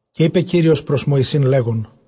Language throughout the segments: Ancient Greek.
Καὶ εἶπε Κύριος πρὸς Μωυσῆν, λέγων,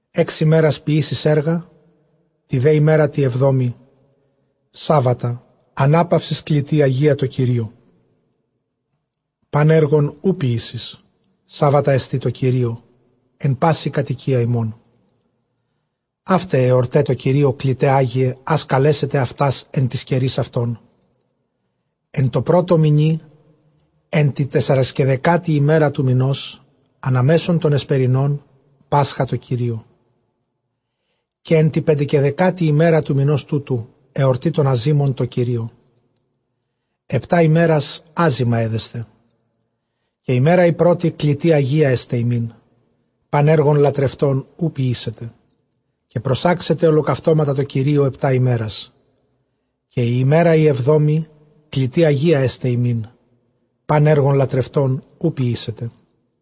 Ἓξ ἡμέρας ποιήσεις ἔργα, τῇ δὲ ἡμέρᾳ τῇ ἑβδόμῃ σάββατα, ἀνάπαυσις, κλητὴ ἁγία τῷ Κυρίῳ· πᾶν ἔργον οὐ ποιήσεις· σάββατά ἐστι τῷ Κυρίῳ ἐν πάσῃ κατοικίᾳ ὑμῶν. Αὗται αἱ ἑορταὶ τῷ Κυρίῳ κληταὶ ἅγιαι, ἃς καλέσετε αὐτὰς ἐν τοῖς καιροῖς αὐτῶν. Ἐν τῷ πρώτῳ μηνὶ, ἐν τῇ τεσσαρεσκαιδεκάτῃ ἡμέρᾳ τοῦ μηνὸς, ἀναμέσον τῶν ἑσπερινῶν πάσχα τῷ Κυρίῳ. Καὶ ἐν τῇ πεντεκαιδεκάτῃ ἡμέρᾳ τοῦ μηνὸς τούτου ἑορτὴ τῶν ἀζύμων τῷ Κυρίῳ· ἑπτὰ ἡμέρας ἄζυμα ἔδεσθε. Καὶ ἡμέρα ἡ πρώτη κλητὴ ἁγία ἔσται ὑμῖν· πᾶν ἔργον λατρευτὸν οὐ ποιήσετε. Καὶ προσάξετε ὁλοκαυτώματα τῷ Κυρίῳ ἑπτὰ ἡμέρας· καὶ ἡ ἡμέρα ἡ ἑβδόμη κλητὴ ἁγία ἔσται ὑμῖν· πᾶν ἔργον λατρευτὸν οὐ ποιήσετε.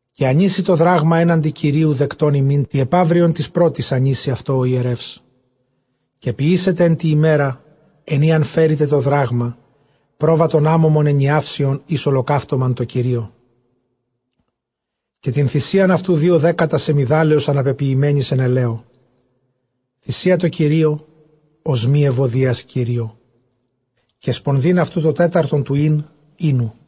Καὶ ἀνοίσει τὸ δράγμα ἔναντι Κυρίου δεκτὸν ὑμῖν· τῇ ἐπαύριον τῆς πρώτης ἀνοίσει αὐτό ὁ ἱερεύς. Καὶ ποιήσετε ἐν τῇ ἡμέρᾳ ἐν ᾗ ἂν φέρητε τὸ δράγμα, πρόβατον ἄμωμον ἐνιαύσιον εἰς ὁλοκαύτωμα τῷ Κυρίῳ. Καὶ τὴν θυσίαν αὐτοῦ δύο δέκατα σεμιδάλεως ἀναπεποιημένης ἐν ἐλαίῳ· θυσία τῷ Κυρίῳ, ὀσμὴ εὐωδίας Κυρίῳ· καὶ σπονδὴν αὐτοῦ τὸ τέταρτον τοῦ ἳν οἴνου.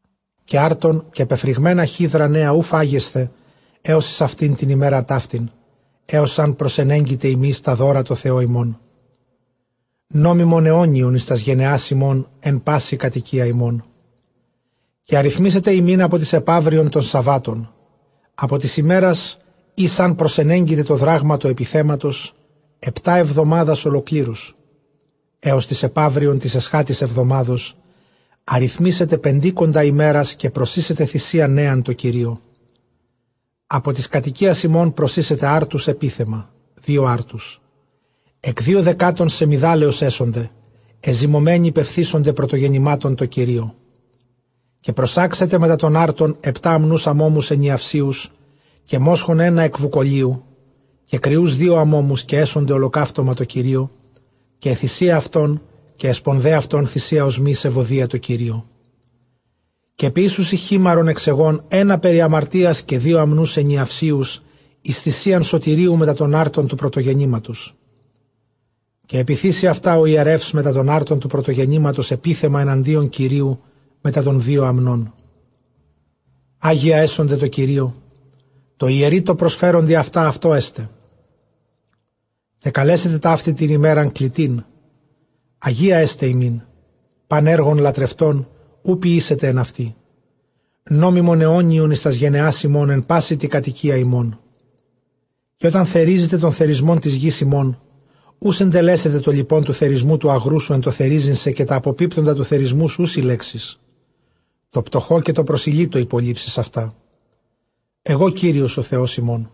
Καὶ ἄρτον, καὶ πεφρυγμένα χίδρα νέα οὐ φάγεσθε ἕως εἰς αὐτὴν τὴν ἡμέραν ταύτην, ἕως ἂν προσενέγκητε ὑμεῖς τὰ δῶρα τῷ Θεῷ ὑμῶν· νόμιμον αἰώνιον εἰς τὰς γενεὰς ὑμῶν ἐν πάσῃ κατοικίᾳ ὑμῶν. Καὶ ἀριθμήσετε ὑμῖν ἀπὸ τῆς ἐπαύριον τῶν σαββάτων, ἀπὸ τῆς ἡμέρας ἧς ἂν προσενέγκητε τὸ δράγμα τοῦ ἐπιθέματος, ἑπτὰ ἑβδομάδας ὁλοκλήρους, ἕως τῆς ἐπαύριον τῆς ἐσχάτης ἑβδομάδος ἀριθμήσετε πεντήκοντα ἡμέρας, καὶ προσοίσετε θυσίαν νέαν τῷ Κυρίῳ. Ἀπὸ τῆς κατοικίας ὑμῶν προσοίσετε ἄρτους ἐπίθεμα, δύο ἄρτους· ἐκ δύο δεκάτων σεμιδάλεως ἔσονται, ἐζυμωμένοι πεφθήσονται πρωτογεννημάτων τῷ Κυρίῳ. Καὶ προσάξετε μετὰ τῶν ἄρτων ἑπτὰ ἀμνοὺς ἀμώμους ἐνιαυσίους, καὶ μόσχον ἕνα ἐκ βουκολίου, καὶ κριοὺς δύο ἀμώμους, καὶ ἔσονται ὁλοκαύτωμα τῷ Κυρίῳ· καὶ αἱ θυσίαι αὐτῶν καὶ αἱ σπονδαὶ αὐτῶν θυσία ὀσμὴ εὐωδίας τῷ Κυρίῳ. Καὶ ποιήσουσι χίμαρον ἐξ αἰγῶν ἕνα περὶ ἁμαρτίας, καὶ δύο ἀμνοὺς ἐνιαυσίους εἰς θυσίαν σωτηρίου μετὰ τῶν ἄρτων τοῦ πρωτογεννήματος. Καὶ ἐπιθήσει αὐτὰ ὁ ἱερεὺς μετὰ τῶν ἄρτων τοῦ πρωτογεννήματος ἐπίθεμα ἐναντίον Κυρίου μετὰ τῶν δύο ἀμνῶν, ἅγια ἔσονται τῷ Κυρίῳ· τῷ ἱερεῖ τῷ προσφέροντι αὐτὰ αὐτῷ ἔσται. Καὶ καλέσετε ταύτην τὴν ἡμέραν κλητήν· ἁγία ἔσται ὑμῖν· πᾶν ἔργον λατρευτὸν οὐ ποιήσετε ἐν αὐτῇ· νόμιμον αἰώνιον εἰς τὰς γενεὰς ὑμῶν ἐν πάσῃ τῇ κατοικίᾳ ὑμῶν. Καὶ ὅταν θερίζητε τὸν θερισμὸν τῆς γῆς ὑμῶν, οὐ συντελέσετε τὸ λοιπὸν τοῦ θερισμοῦ τοῦ ἀγροῦ σου ἐν τῷ θερίζειν σε, καὶ τὰ ἀποπίπτοντα τοῦ θερισμοῦ σου οὐ συλλέξεις· τῷ πτωχῷ καὶ τῷ προσηλύτῳ ὑπολείψεις αὐτά· ἐγὼ Κύριος ὁ Θεὸς ὑμῶν.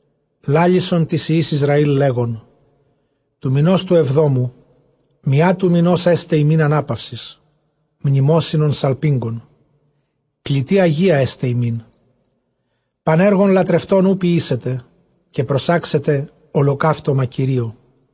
λάλησον τοῖς υἱοῖς Ἰσραὴλ, λέγων, τοῦ μηνὸς τοῦ ἐβδόμου μιᾷ τοῦ μηνὸς ἔσται ὑμῖν ἀνάπαυσις, μνημόσυνον σαλπίγγων· κλητὴ ἁγία ἔσται ὑμῖν· Πᾶν ἔργον λατρευτὸν οὐ ποιήσετε· καὶ προσάξετε ὁλοκαύτωμα Κυρίῳ.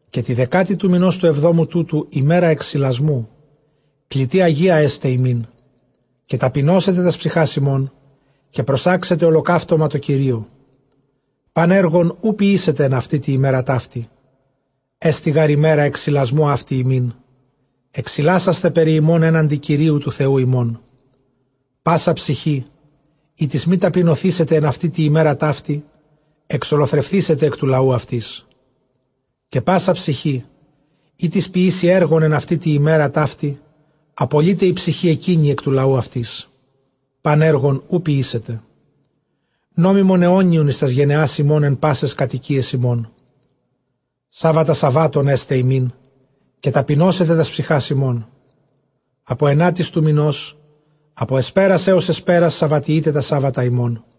καὶ τῇ δεκάτῃ τοῦ μηνὸς τοῦ ἐβδόμου τούτου, ἡμέρα ἐξιλασμοῦ, κλητὴ ἁγία ἔσται ὑμῖν· καὶ ταπεινώσετε τὰς ψυχὰς ὑμῶν, καὶ προσάξετε ὁλοκαύτωμα τῷ Κυρίῳ. Πᾶν ἔργον οὐ ποιήσετε ἐν αὐτῇ τῇ ἡμέρᾳ ταύτῃ· ἔστι γὰρ ἡμέρα ἐξιλασμοῦ αὕτη ὑμῖν, ἐξιλάσασθαι περὶ ὑμῶν ἔναντι Κυρίου τοῦ Θεοῦ ὑμῶν. Πᾶσα ψυχὴ, ἥτις μὴ ταπεινωθήσεται ἐν αὐτῇ τῇ ἡμέρᾳ ταύτῃ, ἐξολοθρευθήσεται ἐκ τοῦ λαοῦ αὐτῆς. Καὶ πᾶσα ψυχὴ, ἥτις ποιήσει ἔργον ἐν αὐτῇ τῇ ἡμέρᾳ ταύτῃ, ἀπολεῖται ἡ ψυχὴ ἐκείνη ἐκ τοῦ λαοῦ αὐτῆς. Πᾶν ἔργον οὐ ποιήσετε· νόμιμον αἰώνιον εἰς τὰς γενεὰς ὑμῶν ἐν πάσαις κατοικίαις ὑμῶν. Σάββατα σαββάτων ἔσται ὑμῖν· καὶ ταπεινώσετε τὰς ψυχὰς ὑμῶν· ἀπὸ ἐνάτης τοῦ μηνὸς, ἀπὸ ἑσπέρας ἕως ἑσπέρας σαββατιεῖτε τὰ σάββατα ὑμῶν.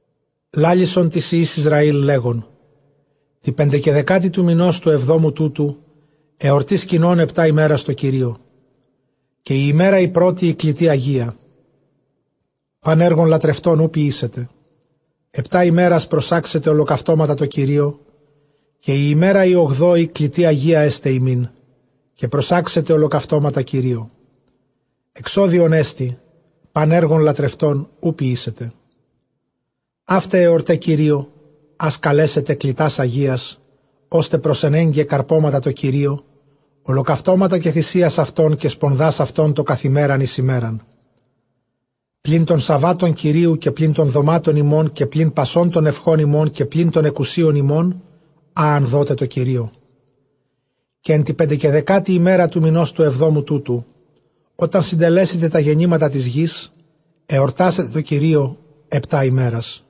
λάλησον τοῖς υἱοῖς Ἰσραὴλ, λέγων, τῇ πεντεκαιδεκάτῃ τοῦ μηνὸς τοῦ ἐβδόμου τούτου, ἑορτὴ σκηνῶν ἑπτὰ ἡμέρας τῷ Κυρίῳ. Καὶ ἡ ἡμέρα ἡ πρώτη κλητὴ ἁγία· πᾶν ἔργον λατρευτὸν οὐ ποιήσετε. Ἑπτὰ ἡμέρας προσάξετε ὁλοκαυτώματα τῷ Κυρίῳ, καὶ ἡ ἡμέρα ἡ ὀγδόη κλητὴ ἁγία ἔσται ὑμῖν· καὶ προσάξετε ὁλοκαυτώματα Κυρίῳ· ἐξόδιόν ἐστι· πᾶν ἔργον λατρευτὸν οὐ ποιήσετε. Αὗται ἑορταὶ Κυρὶῳ, ἃς καλέσετε κλητὰς ἁγίας, ὥστε προσενέγκαι καρπώματα τῷ Κυρίῳ, ὁλοκαυτώματα καὶ θυσίας αὐτῶν, καὶ σπονδὰς αὐτῶν τὸ καθʼ ἡμέραν εἰς ἡμέραν· πλὴν τῶν σαββάτων Κυρίου, καὶ πλὴν τῶν δομάτων ὑμῶν, καὶ πλὴν πασῶν τῶν εὐχῶν ὑμῶν, καὶ πλὴν τῶν ἐκουσίων ὑμῶν, ἃ ἂν δώτε τῷ Κυρίῳ. Καὶ ἐν τῇ πεντεκαιδεκάτῃ ἡμέρᾳ τοῦ μηνὸς τοῦ ἑβδόμου τούτου, ὅταν συντελέσητε τὰ γεννήματα τῆς γῆς, ἑορτάσατε τῷ Κυρίῳ ἑπτὰ ἡμέρας·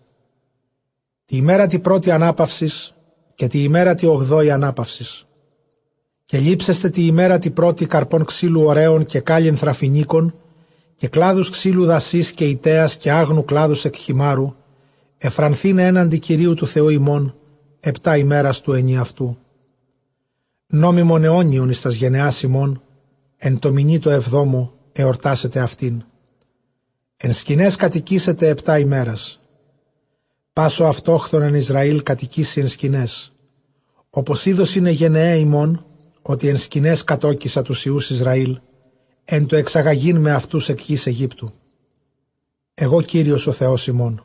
τῇ ἡμέρᾳ τῇ πρώτῃ ἀνάπαυσις, καὶ τῇ ἡμέρᾳ τῇ ὀγδόῃ ἀνάπαυσις. Καὶ λήψεσθε τῇ ἡμέρᾳ τῇ πρώτῃ καρπὸν ξύλου ὡραῖου, καὶ κάλλυνθρα φοινίκων, καὶ κλάδους ξύλου δασεῖς, καὶ ἰτέας, καὶ ἄγνου κλάδους ἐκ χειμάῤῥου, εὐφρανθῆναι ἔναντι Κυρίου τοῦ Θεοῦ ὑμῶν ἑπτὰ ἡμέρας τοῦ ἐνιαυτοῦ. Νόμιμον αἰώνιον εἰς τὰς γενεὰς ὑμῶν· ἐν τῷ μηνὶ τῷ ἑβδόμῳ ἑορτάσετε αὐτήν. Ἐν σκηναῖς κατοικήσετε ἑπτὰ ἡμέρας· πᾶς ὁ αὐτόχθων ἐν Ἰσραὴλ κατοικήσει ἐν σκηναῖς, ὅπως ἴδωσιν αἱ γενεαὶ ὑμῶν, ὅτι ἐν σκηναῖς κατῴκισα τοὺς υἱοὺς Ἰσραὴλ, ἐν τῷ ἐξαγαγεῖν με αὐτοὺς ἐκ γῆς Αἰγύπτου· ἐγὼ Κύριος ὁ Θεὸς ὑμῶν.